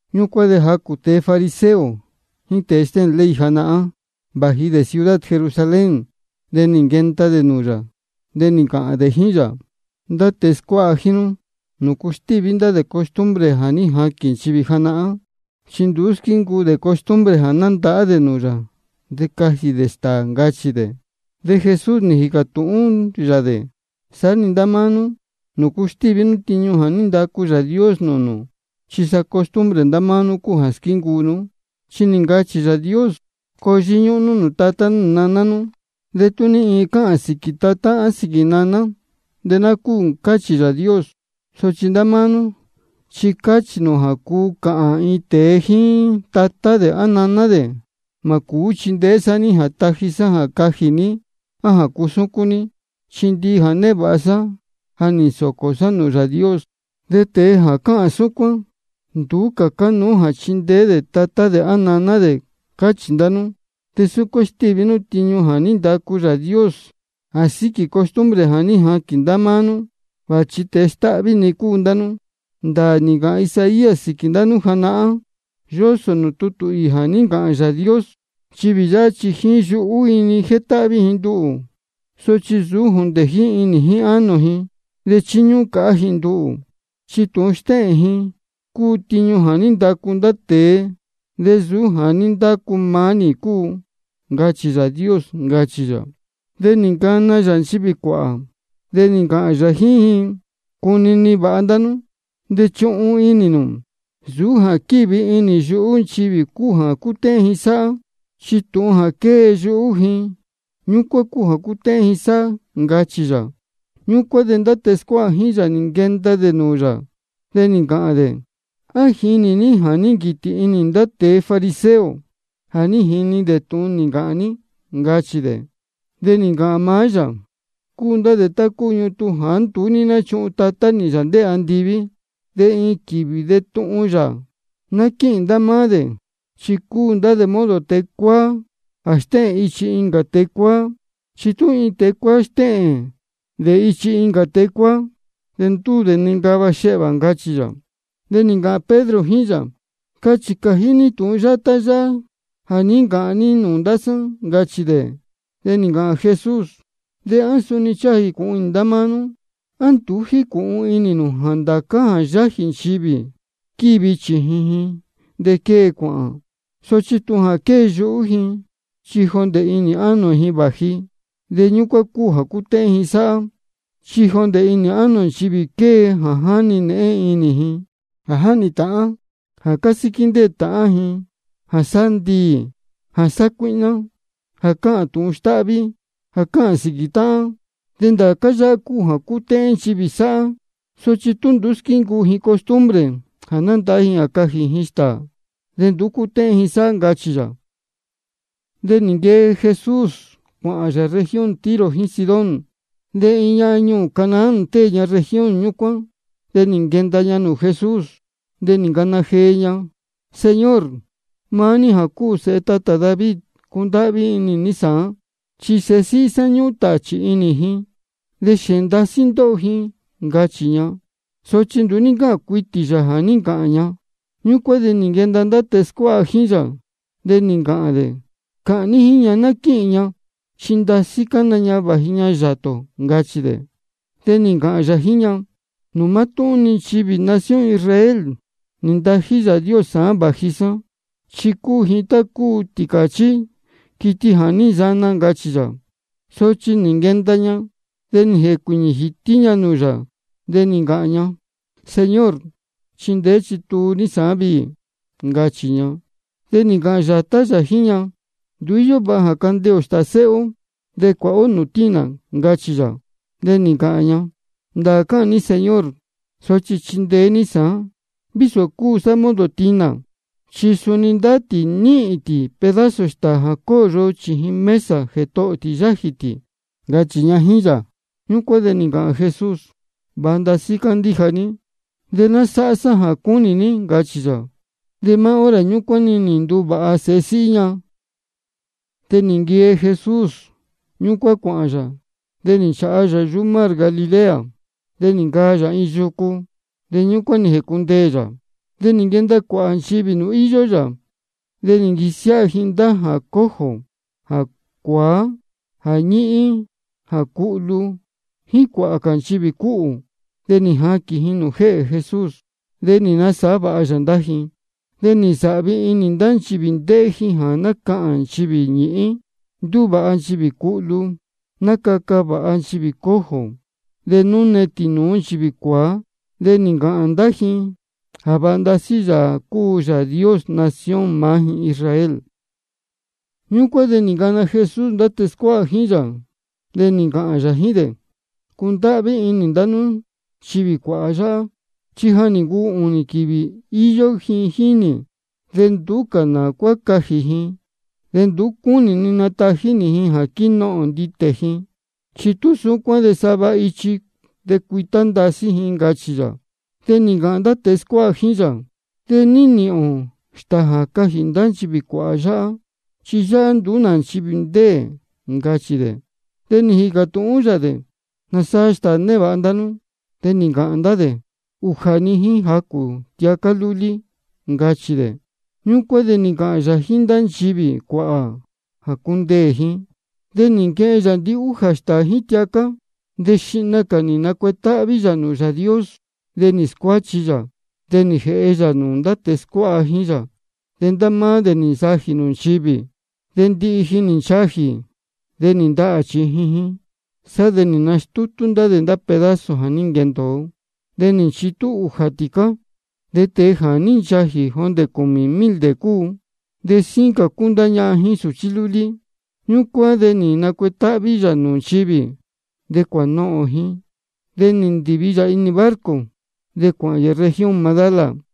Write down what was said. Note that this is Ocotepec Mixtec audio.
Ñúcuán de jacū ndá tēe fariseo jíín tēe stéhēn ley janahán, vāji dē ciudad Jerusalén, de nī nquenda dē nūū yā. De nī ncāhān dē jíín yā: Ndá tēe scuáha jíín nú, ¿nūcu stíví ndá dē costumbre jā ní jaquīn nchivī janahán? Chi nduú squíncuu dē costumbre jā nandahá dē nūū yā de cajī dē stāā, ncachī dē. De Jesús nī jīcā tūhún yā dē: De saá-ni ndá máá nú, ¿nūcu stíví nú tiñu jā ní ndacu Yāā Dios nūū nū? Chi sa costumbre ndá máá nú cúu jā squíncuu nú. Chi nī ncāhān Yāā Dios: Coo yíñúhún nú nūū tatá nú nūū naná nú. De tú ní iin cāhān sīquī tatá á sīquī naná, de ná cúū, cáchī Yāā Dios. Sochi ndá máá nú chi cáchī nū jā cuu cāhān iin tēe jíín tatá dē á naná dē: Mā cūú chindeé sá ní jā taji sá jā cajī ní á jā cusúcún ní, chi ndihi jā névāha sá, ja nī nsōcō sá nūū Yāā Dios. De tēe jā cáhān súcuán, nduú cā cánuú jā chindeé dē tatá dē naná dē, cáchī ndá nú. De súcuán stíví nú tiñu jā ní ndacu Yāā Dios, jā síquī costumbre jā ní jaquīn ndá máá nú. Vāchi tēe stáhví-ni cúu ndá nú. Ndāā nī ncāhān Isaías sīquī ndá nú janahán, yósō nūū tutū īī jā ní ncāhān Yāā Dios: Nchivī yáhá chi jíín yuhú ji-ni jétáhví ji nduhū, sochi nsūú jondē jíín inī jíín ánō ji. De chíñúhún cāhá ji nduhū, chi tūhun jā stéhēn ji cúu tiñu jā ní ndacu ndá tēe, de nsūú jā ní ndacu maá nī cúu. Ncachī Yāā Dios, ncachī yā. De nī ncana yā nchivī cuāhā, de nī ncāhān yā jíín ji: Cunini vāha ndá nú, de chuhun inī nū: Nsūú jā quívi inī yuhú nchivī cúu jā cútéhén ji sáhá. Chi tūhun jā quée yuhú ji, ñúcuán cúu jā cútéhén ji sáhá, ncachī yā. Ñúcuán de ndá tēe scuáha jíín yā nī nquenda dē nūū yā, de nī ncāhān dē: ¿A jínī ní jā ní nquītī inī ndá tēe fariseo jā ní jini dē tūhun nī ncāhān ní? ncachī dē. De nī ncāhān maá yā: Cúu ndá dē tá cúu ñutun jāá nduú ní nchúhun Tatá nī, Yāā ndéē andiví, de iin quīvī de tuhun yā. Ná quíhīn ndá máá dē, chi cúu ndá dē modo tēe cuáá jā stéhēn ichi nūū incā tēe cuáá. Chi tú iin tēe cuáá stéhēn dē ichi nūū incā tēe cuáá, de ndúū dē nincava xehvā, ncachī yā. De nī ncāhān Pedro jíín yā: Cachī cājí ní tūhun yátá yáhá jā ní ncachī ní nūū ndá sá, ncachī dē. De nī ncāhān Jesús: ¿De á suni ncháha ca jīcūhun inī ndá máá nú? ¿A nduú jícūhun inī nū jā ndācá jā yájī nchivī, chi quívi chījin ji, de quée-ni cuāhān? Sochi tūhun jā quée yuhú nchivī, chi jondē inī ánō ji vāji, de ñúcuán cúu jā cútéhén ji sáhá. Chi jondē inī ánō nchivī quée jā jáni nēhén inī, jā jáhnī ndīyi, jā cásíquí ndéē tāhán, jā sáhá ndiī, jā sácuíhná, jā cáhān tūhun stáhví, jā cáhān sīquī táhán. De ndācá yáhá cúu jā cútéhén nchivī sáhá. Sochi tú nduú squíncuu ji costumbre jā nandahá ji de cajī ji stāā, de nduú cútéhén ji sáhá, ncachī yā. De nī nquee Jesús ñúcuán cuāhān yā región Tiro jíín Sidón. De iin ñahan ñuū Canaán ndéē ña región ñúcuán, de nī nquenda ña nūū Jesús. De nī ncana jee ña: Señor, maá ní jā cúu Sēhe tatā David, cundáhví inī ní sāán. Chi sēhe síhí sá, ñúhún tāchī inī ji, de xēēn ndasí ndóho ji, ncachī ña. Sochi nduú ní ncáhān cuitī yā jā ní ncāhān ña. Ñúcuán de nī nquenda ndá tēe scuáha jíín yā, de nī ncāhān dē: Cāhān ní jíín ña ná quíhīn ña, chi ndasí cána ña vāji ña yātā ō, ncachī dē. De nī ncāhān yā jíín ña: Nūū mátúhún-ni nchivī nación Israel nī ntají Yāā Dios sāán vāji sá, chi cúu ji tá cúu tīcāchí, quiti jā ní nsana, ncachī yā. Sochi nī nquenda ña, de nī jēcuīñī jītí ña nūū yā, de nī ncāhān ña: Señor, chindeé chituu ní sāán viī, ncachī ña. De nī ncāhān yātá yā jíín ña: Nduú íyó vāha jā candeē ō stāā sēhe ó de cuāha ó nūū tinā, ncachī yā. De nī ncāhān ña: Ndāā cáhān ní Señor, sochi chindeé ní sāán vísō cúu sá modo tinā. Chi suni ndá tī níhīn tī pedazo stāā jā cóyo chījin mesa jētohō tī yájī tī, ncachī ña jíín yā. Ñúcuán de nī ncāhān Jesús: Vāha ndasí cándíja ní, nánā. De ná sáhá sá jā cúnī ní, ncachī yā. De maá hora ñúcuán nī nduvāha-ni sēhe síhí ña. De nī nquee Jesús ñúcuán cuāhān yā, de nī nchāha yā yuhú mar Galilea. De nī ncaa yā iin yucu, de ñúcuán nī jēcundeē yā. De nī nquenda cuāhā nchivī nūū íyó yā, de nī nquisiáha ji ndá jā cojo, jā cuāá, jā ñīhín, jā cuhlu, jíín cuāhā cā nchivī cúhū. De nī jaquīn ji nūū jéhē Jesús. De nī nasāhá vāha yā ndá ji. De nī nsāhvi inī ndá nchivī ndéhé ji jā nácahān nchivī ñīhín, ndúvāha nchivī cuhlu, nácaca vāha nchivī cojo, de nánune tīnūú nchivī cuāá. De nī ncāhān ndá ji jā vāha ndasí Yāā cúu Yāā Dios nación maá ji Israel. Ñúcuán de nī ncana Jesús ndá tēe scuáha jíín yā, de nī ncāhān yā jíín dē: Cúndáhví inī ni ndá nchivī cuāhā yáhá, chi ja nī ncuu ūnī quīvī íyó ji jíín nī, de nduú cā nā cuá cajī ji. De nduú cúnī ni natají nī ji jā quínohōn nditē ji, chi tú súcuán de sava ichi de cuītá ndasí ji, ncachī yā. De nī ncāhān ndá tēe scuáha jíín yā: ¿De ní nīhīn ō stāā jā cajī ndá nchivī cuāhā yáhá? Chi yáhá nduú nā nchivī ndéē, ncachī dē. De nī jīcā tūhún yā dē: ¿Nāsaa stāā névāha ndá nú? De nī ncāhān ndá dē: Ujā-ni, jíín jacū tiacá lúlí, ncachī dē. Ñúcuán de nī ncāhān yā jíín ndá nchivī cuāhā jā cundeē ji. De nī nquehen yā ndihújā stāā jíín tiacá, de xihna cā nī nacuetáhví yā nūū Yāā Dios. De nī scuáchi yā, de nī jēhe yā nūū ndá tēe scuáha jíín yā, de ndá máá dē nī nsajī nūū nchivī. De ndihi ji nī nchajī, de nī ndahā chījin ji. Sá de nī nastútú ndá dē pedazo jā ní nquendōo, de nī nchitú ūjā tīcá. De tēe jā ní nchajī, jondē cūmī mil dē cúu, de síín cā cúu ndá ñahan jíín sūchí lúlí. Ñúcuán de nī nacuetáhví yā nūū nchivī, de cuānohōn ji. De nī ndīvi yā inī barco, de cuāhān yā región Magdala.